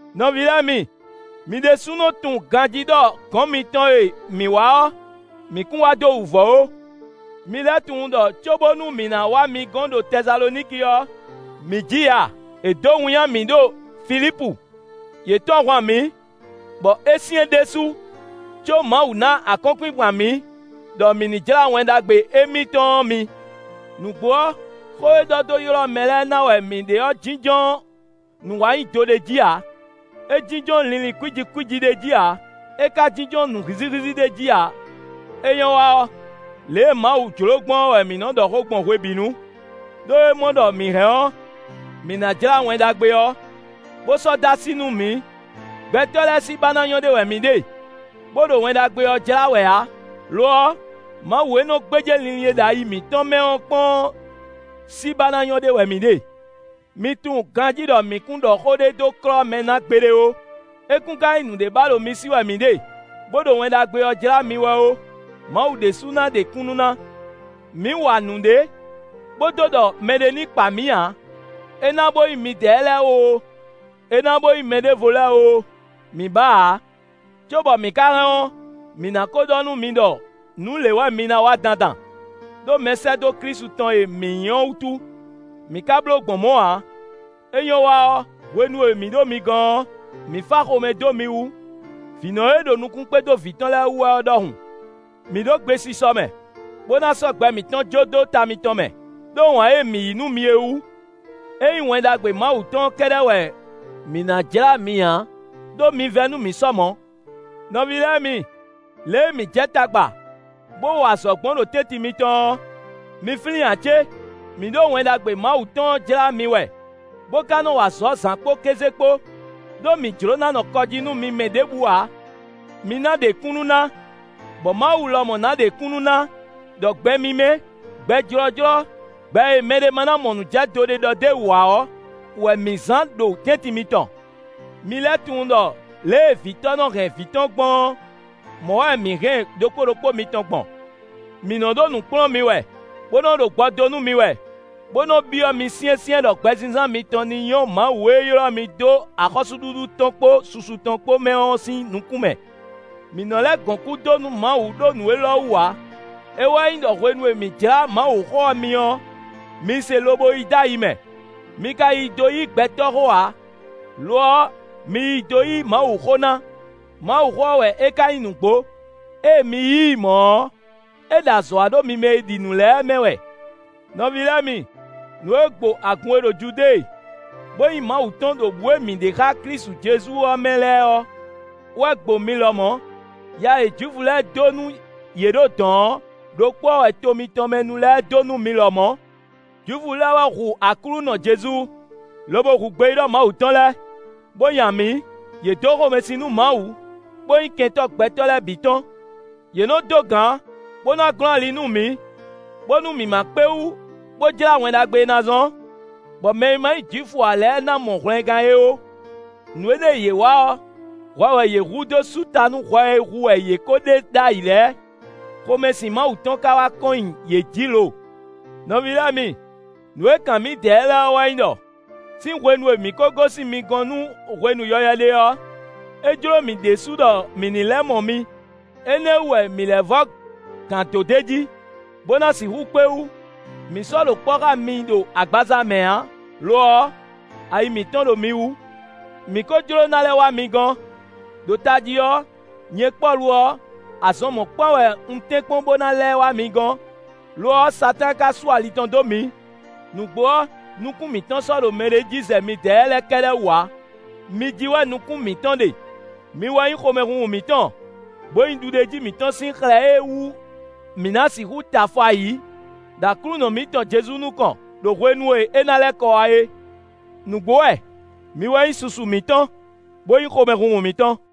Nɔví lɛ́ɛ mi, mi ɖésúnɔ tunwun ganjí ɖɔ gɔ̌n mitɔn e mǐ wá ɔ́, mǐ kún wá dó wǔvɔ́ ó. Mi lɛ́ tunwun ɖɔ cóbónú mǐ ná wá mi gɔn ɖo Tɛsaloniki ɔ́, mǐ ji ya; è dǒ winnyá mǐ ɖo Filípu. Yě tɔ́n ahwan mǐ, bɔ é syɛ́n ɖésú, có Mawu ná akɔ́nkpinkpan mǐ, ɖɔ mǐ ní jlá Wɛn Ɖagbe émítɔn ɔ́ mi. Nǔgbó ɔ́, xó e ɖɔ dó ylɔ́ mɛ lɛ́ɛ ná wɛ mǐ ɖe ɔ́ jínjɔ́n nǔwanyido ɖé jí ǎ; é jínjɔ́n linlin kwíji kwíji ɖé jí ǎ; é ka jínjɔ́n nǔ hízíhízí ɖé jí ǎ. É nyɔ́ wa ɔ́, lě e Mawu jló gbɔn ɔ́ wɛ mǐ nɔ ɖɔ xó gbɔn hwebǐnu, ɖó é mɔ ɖɔ mǐ hɛn ɔ́, mǐ ná jlá Wɛn Ɖagbe ɔ́, bó sɔ́ dó así nú mǐ; gbɛtɔ́ lɛ́ɛ sí ba ná nyɔ́ ɖe wɛ mǐ ɖe, bó ɖo Wɛn Ɖagbe ɔ́ jlá wɛ ǎ; lo ɔ́, Mawu e nɔ gbéjé linlin e ɖo ayi mǐtɔn mɛ ɔ́ kpɔ́n ɔ́ sí ba ná nyɔ́ ɖe wɛ mǐ ɖe. Mi tunwun ganjí ɖɔ mǐ kún ɖɔ xó ɖé dó klɔ́ mɛ ná gbeɖé ó; é kún ka nyí nǔɖé ba ɖo mi sí wɛ mǐ ɖe, bó ɖo Wɛn Ɖagbe ɔ́ jlá mi wɛ ó; Mawu ɖésú ná ɖe kúnnu ná. Mǐ wa nǔɖé bó dó ɖɔ mɛɖé ní kpa mǐ ǎ; é ná bo nyí midɛɛ lɛ́ɛ oo, é ná bo nyí mɛɖěvo lɛ́ɛ oo, mǐ ba ǎ. Cóbɔ mǐ ka hɛn ɔ́, mǐ ná ko ɖɔ nú mi ɖɔ nǔ lě wɛ mi ná wa dandan, ɖó mɛsɛ́dó Klísu tɔn e mǐ nyí ɔ́ wútu; mǐ ka bló gbɔn mɔ̌ ǎ; é nyɔ́ wa ɔ́, hwenu e mǐ ɖo mi gɔn ɔ́, mǐ fá xomɛ dó mi wú, vǐnɔ e ɖo nukún kpé dó vǐ tɔn lɛ́ɛ wú wɛ ɔ́ ɖɔhun. Mǐ ɖo gbesisɔ mɛ, bó ná sɔ́ gbɛ mǐtɔn jó dó ta mitɔn mɛ, ɖó wǎn e mǐ nyí nú mi é wú; é nyí Wɛn Ɖagbe Mawu tɔn ɔ́ kɛ́ɖɛ́ wɛ mǐ ná jlá mi ǎ; ɖó mi vɛ́ nú mǐ sɔ mɔ̌. Nɔví lɛ́ɛ mi, lě e mǐ jɛ tagba, bó wa azɔ̌ gbɔn ɖo tɛ́ntin mitɔn ɔ́, mi flín ǎ cé? Mǐ ɖo Wɛn Ɖagbe Mawu tɔn ɔ́ jlá mi wɛ, bó ka nɔ wa azɔ̌ zǎn kpó kéze kpó, ɖó mǐ jló ná nɔ kɔ jí nú mi mɛ ɖěbǔ ǎ. Mi ná ɖe kúnnu ná, bɔ Mawu lɔmɔ̌ ná ɖe kúnnu ná ɖɔ gbɛ mímɛ́, gbɛ jlɔ́jlɔ́, gbɛ e mɛɖé ma ná mɔ nǔjɛdo ɖé ɖɔ d'é wú ǎ ɔ́ wɛ mǐ zán ɖo tɛ́ntin mitɔn. Mi lɛ́ tunwun ɖɔ lě e vǐtɔ́ nɔ hɛn vǐ tɔn gbɔn ɔ́, mɔ̌ wɛ mǐ hɛn ɖokpó ɖokpó mitɔn gbɔn. Mǐ nɔ ɖo nǔ kplɔ́n mi wɛ, bó nɔ ɖo gbɔ dó nú mi wɛ, bó nɔ byɔ́ mi syɛ́nsyɛ́n ɖɔ gbɛzínzán mitɔn ní nyɔ́ Mawu e ylɔ́ mi dó axɔ́súɖuɖu tɔn kpó susu tɔn kpó mɛ ɔ́ sín nukún mɛ. Mǐ nɔ lɛ́ gɔn kú dó nú Mawu ɖó nǔ élɔ́ wú ǎ; é wɛ nyí ɖɔ hwenu e mǐ jlá Mawuxó ɔ́ mi ɔ́, mi se lobo yí dó ayi mɛ; mi ka yí dó yí gbɛtɔ́ xó ǎ; lo ɔ́ mi yí dó yí Mawuxó ná; Mawuxó ɔ́ wɛ é ka nyí nǔgbó; ée mi yí i mɔ̌ ɔ́, é ɖo azɔ̌ wa ɖo mi mɛ e ɖi nǔ lɛ́ɛ mɛ wɛ. Nɔví lɛ́ɛ mi, nǔ e gbo agun e ɖo Judée, bó nyí Mawu tɔn ɖo bǔ e mǐ ɖe xá Klísu Jezu ɔ́ mɛ lɛ́ɛ ɔ́ wɛ gbo mi lɔmɔ̌. Ya e Jwifu lɛ́ɛ dó nú yě ɖo dɔ̌n ɔ́ ɖokpó ɔ́ wɛ to mitɔn mɛ nu lɛ́ɛ dó nú mi lɔmɔ̌. Jwifu lɛ́ɛ wɛ hu Aklúnɔ Jezu, lobo hu gbeyíɖɔ Mawu tɔn lɛ́ɛ, bó nya mǐ. Yě dó xomɛsin nú Mawu, bó nyí kɛntɔ́ gbɛtɔ́ lɛ́ɛ bǐ tɔn. Yě nɔ dó gǎn, bó ná glɔ́n ali nú mǐ, bónú mǐ má kpé wú, bó jlá Wɛn Ɖagbe e ná zɔ́n, bɔ mɛ e ma nyí Jwifu ǎ lɛ́ɛ ná mɔ hwlɛngán é ó. Nǔ énɛ́ e yě wa ɔ́, hwɛ wɛ yě hu dó sú ta nú hwɛ e hu wɛ yě ko ɖe ɖ'ayǐ lɛ́ɛ. Xomɛsin Mawu tɔn ka wá kɔn nyi yě jǐ lo. Nɔví lɛ́ɛ mi, nǔ e kan mǐdɛɛ lɛ́ɛ ɔ́ wɛ nyí ɖɔ: sín hwenu e mǐ ko gosín mi gɔn nú hwenu yɔywɛ ɖé ɔ́, é jló mǐ ɖésú ɖɔ mǐ ní lɛ́ mɔ mi; énɛ́ wú wɛ mǐ lɛ́ vɔ́ gǎn dó d'é jí, bó ná sixú kpé wú; mǐ sɔ́ ɖo kpɔ́ xá mi ɖo agbaza mɛ ǎ; lo ɔ́, ayi mǐtɔn ɖo mi wú. Mǐ ko jló ná lɛ́ wá mi gɔ́n; ɖo tají ɔ́, nyɛ Pɔ́lu ɔ́, azɔn mɔ̌kpán wɛ un tɛ́nkpɔ́n bó ná lɛ́ wá mi gɔ́n; lo ɔ́, Satáan ka sú ali tɔn dó mǐ. Nǔgbó ɔ́, nukún mǐtɔn sɔ́ ɖo mɛɖé jí zɛ midɛɛ lɛ́ɛ kɛ́ɖɛ́ wú ǎ; mi jí wɛ nukún mǐtɔn ɖe; mi wɛ nyí xomɛhunhun mǐtɔn, bó nyí ɖuɖéjí mǐtɔn sín xlɛ́ e wú mǐ ná sixú tɛ afɔ ayǐ ɖo Aklúnɔ mǐtɔn Jezu nukɔn, ɖo hwenu e é ná lɛ́ kɔ wá é. Nǔgbó wɛ! Mi wɛ nyí susu mǐtɔn, bó nyí xomɛhunhun mǐtɔn.